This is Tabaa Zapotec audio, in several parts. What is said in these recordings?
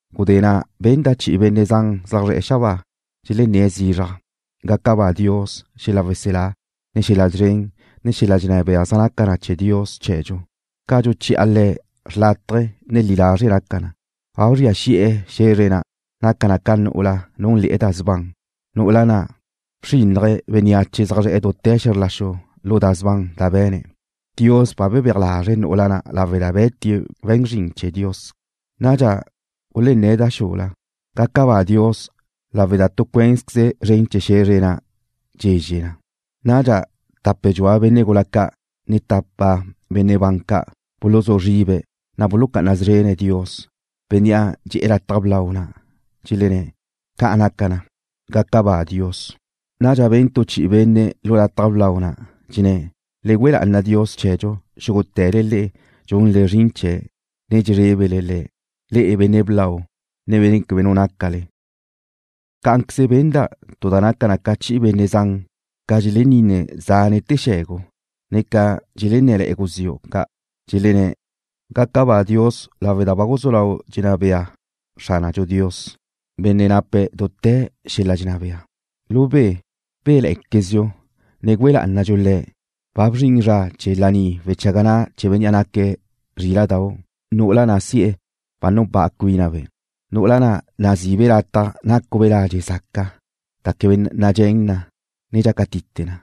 Gudé na' benda' chi'i benne' zan zaj zre̱'e̱ xabáa, dxelenné̱' zizraj: ¡Gaca ba Dios! ¡Xel-la' weselá, ne xel-la' szren, ne xel-la' dxenná bea zaj naca na chee̱ Dios chee̱dxu. Ca dxuchi'a Le̱', xrlátaje̱, ne li lazre' naca na! ¡Ba bzria xi'e̱ xe̱zre na' dxulé'e na nu'ula na' núnle̱'e̱ da sban, nu'ula na' bxrínnaje̱' bénneache zaj zre̱'e̱ dute̱ xe̱zr la xu lu da sban da be̱ne̱'! ¡Dios ba bebéaj lazre̱' nu'ula na' lawe' da be̱tie̱' we̱n zrin ca' chee̱ Dios! Nadxa gulenné̱' da xula: ―¡Gaca ba Dios lawe' da tu cuénzqueze zren chee̱ xe̱zre na' dxezxe na! Nadxa tape dxua benne' gula ca' ne tapa benne' ban ca' buluzú zribe̱', na' bulucá'ana szrene̱' Dios, Bénnea' dxe'e̱ lataj blau na', dxelenné̱': ―¡Ca' naca na! ¡Gaca ba Dios! Nadxa ben tu chi'i benne' lu lataj blau na', dxenné̱': ¡Le güe lá'ana Dios chee̱dxu, xúgute̱le le'e dxunle zrin chee̱', ne dxezrébele Le̱', le'e benne' blau, ne benne' quebe nu nácale! Cá'anqueze benda' tu da naca ca chi'i benne' zan, ca dxeleninne zánete̱ xe̱gu, ne ca dxelenné̱le̱'e̱ guziu' ca', dxelenné̱': ¡Gaca ba Dios lawe' da ba guzú lau dxenná bea Xránadxu Dios, Benne' nape̱' dute̱ xel-la' dxenná bea! ¡Du be! ¡Béle̱'e̱quezdxu, ne güe lá'anadxu Le̱'! ¡Ba bzrin zra chee̱ laní wechaga na' chee̱ Bénnea' naque̱' Zríla'dau'! Nu'ula na' si'e̱ ba nupá'a cuínabe', nu'ula na' nazi'ibe' lataj nácube' ladxe' zaca, da quebe nadxén na, ne dxácatite na.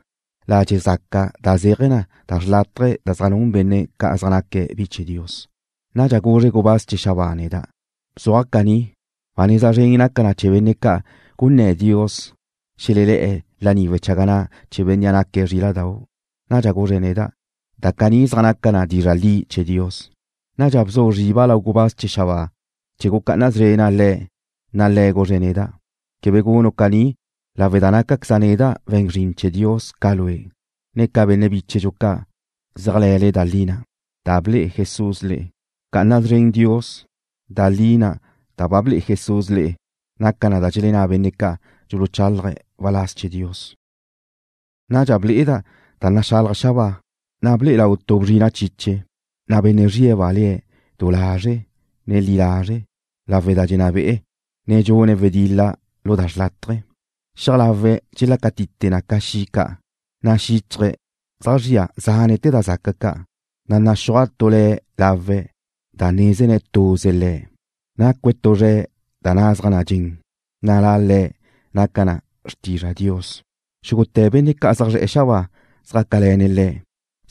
Ladxe' zaca na' zéaje̱ na da xrlátaje̱ da zaj nun benne' ca' zaj naque̱' bi chee̱ Dios. Nadxa guzre gubáz chee̱ xabáa neda': ―Bzuaj caní: Ba neza zren naca na chee̱ benne' ca' gunné̱ Dios xelelé̱'e̱ laní wechaga na' chee̱ Bénnea' naque̱' Zríla'dau'. Nadxa guzre̱' neda': ―Da caní zaj naca na dizra' li chee̱ Dios. Nadxa bzu zriba' lau gubáz chee̱ xabáa na' chee̱ gucá'ana szrena' le̱', na' le̱' guzre̱' neda': ―Quebe gunu' caní lawe' da nácaqueza' neda' we̱n zrin chee̱ Dios ca lue', ne ca benne' bichu' ca' zéajle̱le da li na' da ble'e Jesús le'e. Bca'ana szren Dios. Da li na' da ble'e Jesús le'e naca na da dxelenná benne' ca' dxuluchálaje̱' waláz chee̱ Dios. Nadxa ble'eda' ba naxalaj xabáa, na' ble'e lau tu bzrina' chiche, na' Benne' zrie̱'-ba' le̱' Du Lazre', ne Li Lazre', lawe' da dxenná be'e̱, ne dxune̱' wedil-la lu da xrlátaje̱. Xiaj lawe̱' dxelácatite na ca xi' ca, na' xíchaje̱' zaj zria zánete̱ da zaca ca', na' naxúaj tu le̱' lawe̱', da nézene̱' tuze Le̱'. Nacue̱' tu zre̱' da nazaj na dxen, na' La Le̱' naca na Xrtizra Dios. Xúgute̱ benne' ca' zaj zre̱'e̱ xabáa zjácale̱ne̱' Le̱',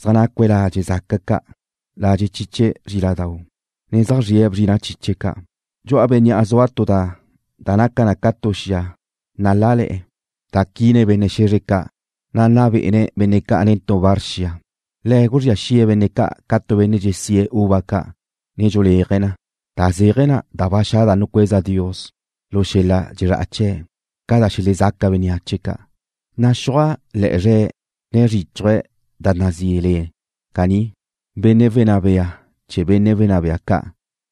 zaj nacue̱' ladxe' zaca ca', ladxe' chiche zríladau', ne zaj zrie̱' bzrina' chiche ca'. Dxu'a Bénnea' zua tu da naca na ca tu xia nalále̱'e̱ da quine̱' benne' xe̱zre ca', na' nna be'ene̱' benne' ca' nen tu bar xia. Le̱' guzría xi'e̱ benne' ca' ca tu benne' dxesíe̱' uva ca', ne dxuléaje̱' na, da zéaje̱ na da ba xa' da nucueza Dios lu xel-la' dxezrá'a chee̱', ca da xelezaca bénneache ca'. Naxúaj le̱'e̱ zre̱', ne zríchuje̱' da nazí Le̱' caní: Benne' Dxenná Be'ene̱' Benne' Wenná Bea Ca',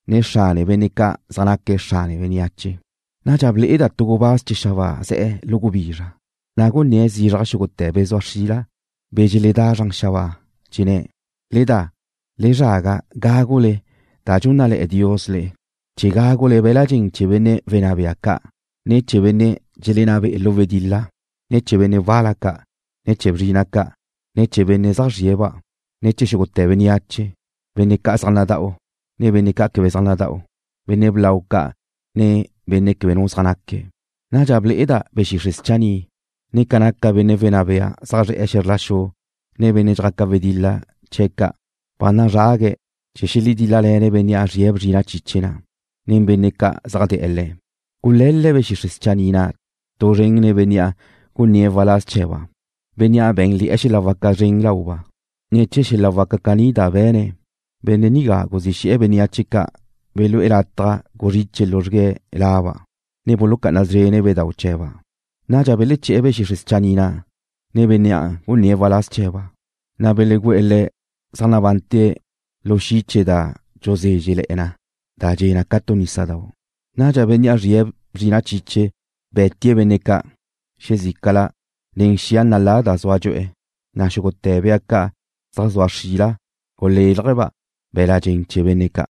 ne Xrane Benne' Ca' Zaj Naque̱' Xrane Bénneache. Nadxa ble'eda' tu gubáz chee̱ xabáa ze̱' lu gubizra, na' gunné̱' zizraj xúgute̱ be̱ zua xrila, be̱ dxeledá zran xabáa, dxenné̱': ―Le da. Le zraga gágule da dxúnnale̱'e̱ Dios le'e, chee̱ gágule be̱la dxen chee̱ benne' wenná bea ca', ne chee̱ benne' dxelenná be'e̱ lu wedil-la, ne chee̱ benne' wal-la ca', ne chee̱ bzrina' ca', ne chee̱ benne' zaj zrie̱'-ba', ne chee̱ xúgute̱ bénneache, benne' ca' zaj nadá'ue̱', ne benne' ca' quebe zaj nadá'ue̱', benne' blau ca' ne benne' quebe nu zaj naque̱'. Nadxa ble'eda' be̱ xixre' schanni', ne ca naca benne' wenná bea zaj zre̱'e̱ xe̱zr la xu nen benne' dxjaca wedil-la chee̱ ' ca', ba nazrague̱' chee̱ xeledíl-lale̱ne' Bénnea' zrie̱' bzrina' chiche na', ne nen benne' ca' zaj de̱'e̱ Le̱'. Gule̱l-le̱' be̱ xixre' schanni' na' tu zren nen bénnea' gunné̱' waláz chee̱ba', bénnea' bé̱nle̱'e̱ xel-la' waca zren lauba'. Ne̱ chee̱ xel-la' waca caní da be̱ne̱', benne' nigá guzí xe̱'e̱ benne' ca' belú'e̱ lataj guzriche luzrgue̱' laba', ne bulucá'ana szrene̱' bedau' chee̱ba'. Nadxa beleché̱'e̱ be̱ xixre' schanni' na', ne bénnea' gunné̱' waláz chee̱ba', na' belegu'e̱ le̱' zaj nabante̱' lu xi' chee̱ da dxuzézxele̱'e̱ na da dxe' ca tu nísadau'. Nadxa Bénnea' zrie̱' bzrina' chiche be̱tie̱' benne' ca' xezícala nen xia nalá na' zua dxu'e, na' xúgute̱ bea ca' zaj zua xrila gulélajba' be̱la dxen chee̱ benne' ca'.